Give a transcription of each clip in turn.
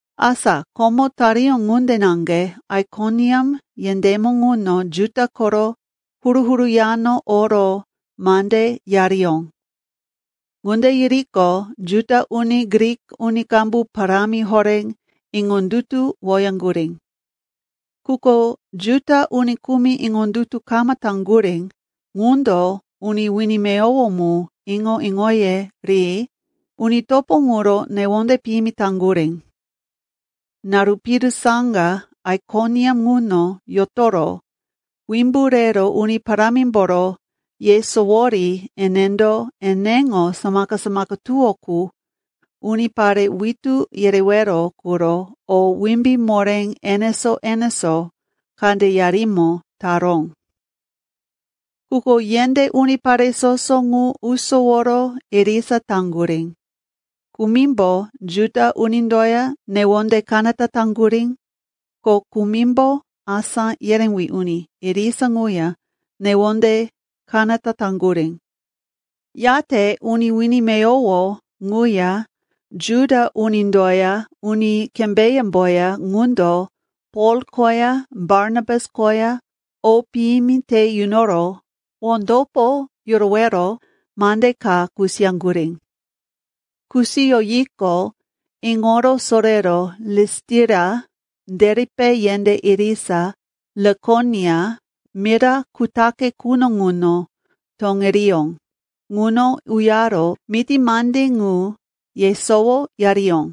Asa komo tariyó ŋunde naŋge Aikoniam yendémo ŋuno Juda koro huru-huru yano oro mande yariyó. Ŋunde yiriqo, Juda uni, Grik uni qambu parámi horé iŋondutuwoyaŋgurí. Quko Juda uni kumi iŋondutu kama taŋgurí ŋundo uni wini meyowo mu iŋo-iŋoye ri uni topo ŋuro newonde piyimi taŋgurí. Naru piru saŋga Aikoniam ŋuno yotoro wimbu rero Uni Parámimboro yesowori enendo eneŋo samaka-samaka tuwó qu unipare witú yerewero quro o wimbí moré enesó-enesó kandeyarimo taró. Quko yendé unipare soso ŋu usoworo irisa taŋgurí. Kumimbo Juda unindoya newonde kanata taŋgurí, ko kumimbo asá yerewí uni irisa ŋuya newonde kanata taŋgurí. Yate uni wini meyowo ŋuya Juda unindoya uni kembéyemboya ŋundo Pol koya Barnabas koya o piyimi te yunoro wondopo yurowero mande ka kusiyaŋgurí. Kusiyoyiqo, iŋoro sorero Listira, Deripe yendé irisa Likonia mira kutaqe quno ŋuno toŋiriyó. Ŋuno uyaro miti mande ŋu yesowoyariyó.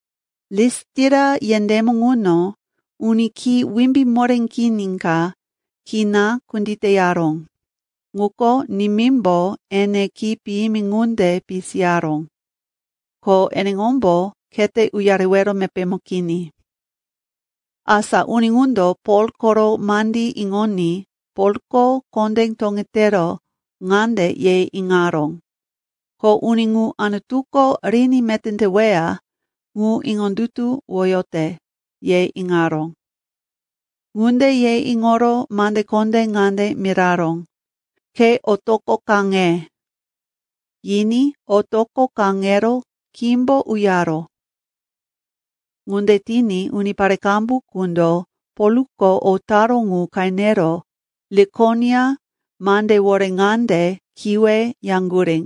Listira yendémo ŋuno uni khí wimbí moré kini ka kina kunditeyaró, ŋuko nimímbo ene khí piyimi ŋunde pisiyaró, ko eneŋombo khete uyarewero mepémo kini. Asa uni ŋundo Pol koro mandí iŋoní Polko kondé toŋetero ŋande ye iŋaró, ko uni ŋu Anutuko riní meté teweya ŋu iŋondutuwoyote, ye iŋaró. Ŋunde ye iŋoro mande kondé ŋande miraró, “Ke otoqo kaŋe.” Yiní otoqo kaŋero khímbo uyaró. Ŋunde tiní unipare qambu qundo Polko o taró ŋu qenero Likonia mandewore ŋande kiwe yaŋgurí,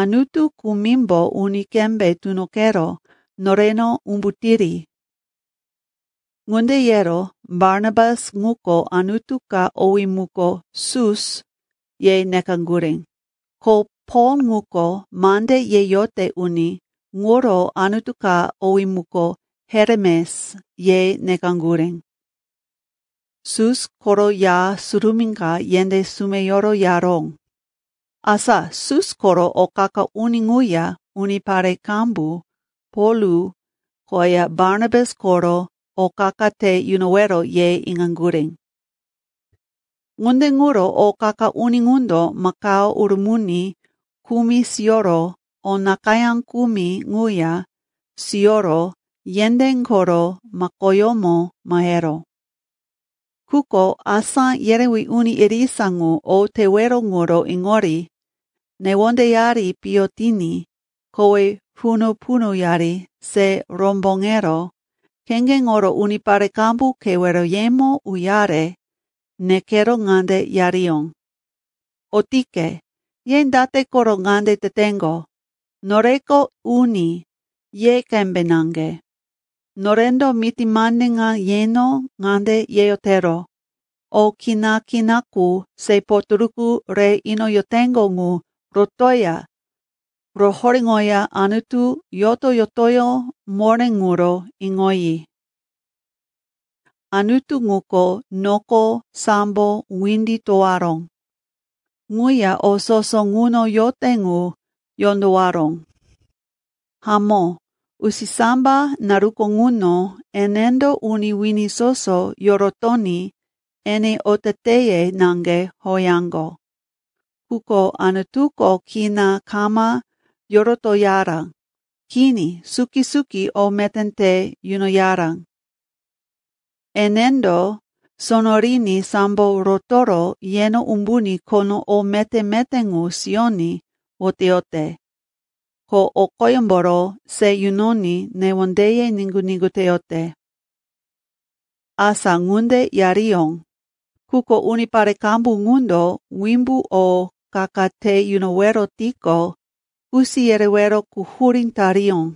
“Anutu kumimbo uni qembe tunoqero noreno umbutiri!” Ŋunde yero Barnabas ŋuko anutu ka owí muko, “Sus,” ye nekaŋgurí. Ko Pol ŋuko mande yeyote uni, ŋuro anutu ka owí muko, “Heremes,” ye nekaŋgurí. Sus koro ya surumí ka yendé sumeyoro yaró. Asa Sus koro o qa-qa uni ŋuya unipare qambu Pol koya Barnabas koro o qa-qa te yunowero ye iŋaŋgurí. Ŋunde ŋuro o qa-qa uni ŋundo makao urumuni kumi siyoro o nakayá kumi ŋuya siyoro yendé koro makoyómo maheró. Quko asá yerewí uni irisa ŋu o tewero ŋuro iŋori newondeyari piyo tiní kowe punu-punuyari se romboŋero kheŋgeŋoro unipare qambu keweroyemo uyare nekero ŋande yariyó, “Otike, ye date koro ŋande teteŋgo? Noreko uni, ye qembe naŋge. Norendo miti mande ŋa yeno ŋande yeyotero, o kina-kina qu se potoruku re inoyoteŋgo ŋu rotoya rohoréŋoya Anutu yoto-yotoyó moré ŋuro iŋoyi. Anutu ŋuko noko sambo windi towaró. Ŋuya o soso ŋuno yote ŋu yondowaró. Hamó, usisamba naruko ŋuno enendo uni wini soso yorotoní ene oteteye naŋge howeyaŋgo. Quko Anutuko kina kama yorotoyara. Kini, suki-suki o meté te yunoyara. Enendo sono riní sambo rotoro yeno umbuní khono o meté-meté ŋu siyoní woteyote. Ko o qoyemboro se yunoní newondeye niŋgu-niŋgu teyote.” Asa ŋunde yariyó, quko unipare qambu ŋundo wimbu o qa-qa te yunowero tiqo, kusi yerewero quhurí tariyó.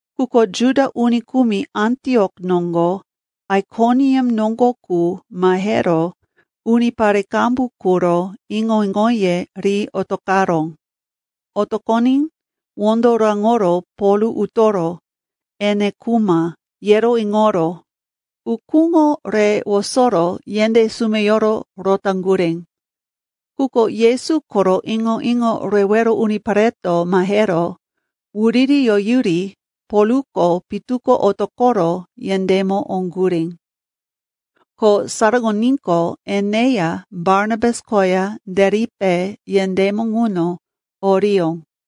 Quko Juda uni kumi Antiok noŋgo, Aikoniam noŋgo qu mahero unipare qambu quro iŋo-iŋoye ri otoqaró. Otoqoní wondo raŋoro Pol utoro, ene khuma, yero iŋoro ukúŋo re wosoro yendé sumeyoro rotaŋgurí. Quko Yesu koro iŋo-iŋo rewero unipareto mahero wuririyoyuri Polko pitu ko otoqoro yendémo oŋgurí. Ko saraŋoníqo, eneya Barnabas koya Deripe yendémo ŋuno oriyó.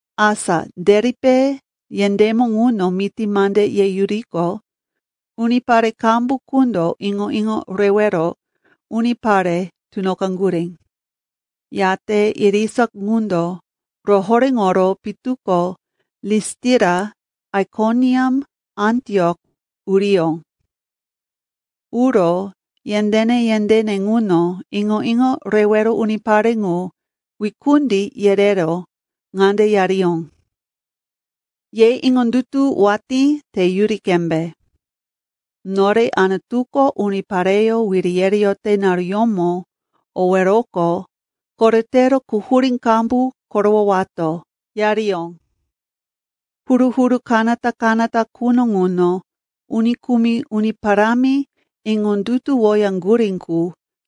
Asa Deripe yendémo ŋuno miti mande yeyuriqo, unipare qambu qundo iŋo-iŋo rewero unipare tunoqaŋgurí. Yate irisa ŋundo rohoréŋoro pitu ko Listira, Aikoniam, Antiok uriyó. Uro yendéne-yendéne ŋuno iŋo-iŋo rewero unipare ŋu wikundi yerero ŋande yariyó, “Ye iŋondutu watí teyuri qembe. Nore Anutuko unipareyó wiri yereyote naruyómo oweroqo koretero quhurí qambu korowowato,” yariyó. Huru-huru kanata-kanata quno ŋuno uni kumi Uni Parámi iŋondutuwoyaŋgurí qu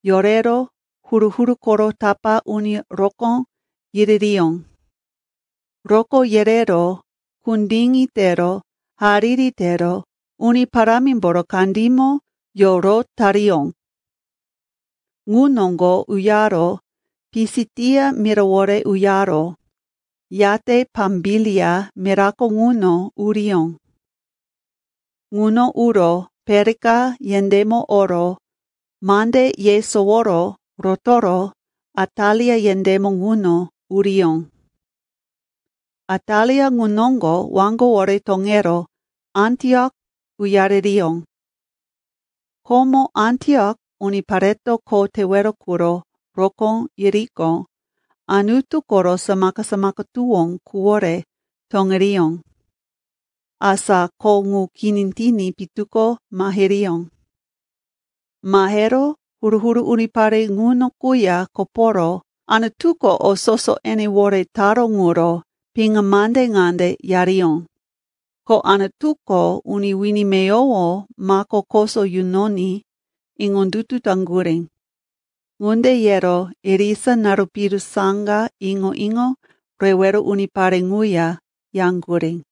yorero huru-huru koro tapá uni rokó yiririyó. Rokó yerero kundiŋi tero hariri tero Uni Parámimboro kandímo yorotariyó. Ŋu noŋgo uyaro Pisitia mirawore uyaro, yate Pambilia mirako ŋuno uriyó. Ŋuno uro Perika yendémo oro mande yesoworo rotoro Atalia yendémo ŋuno uriyó. Atalia ŋu noŋgo waŋgowore toŋero Antiok uyaririyó. Komo Antiok unipareto kho tewero quro rokó yiriqo, Anutu koro samaka-samaka tuwó quwore toŋiriyó. Asa kho ŋu kini tiní pitu ko mahiriyó. Mahero huru-huru unipare ŋuno quya koporo Anutuko o soso enewore taró ŋuro piŋa mande ŋande yariyó, ko Anutuko uni wini meyowo mako koso yunoní iŋondutu taŋgurí. Ŋunde yero irisa naru piru saŋga iŋo-iŋo rewero unipare ŋuya yaŋgurí.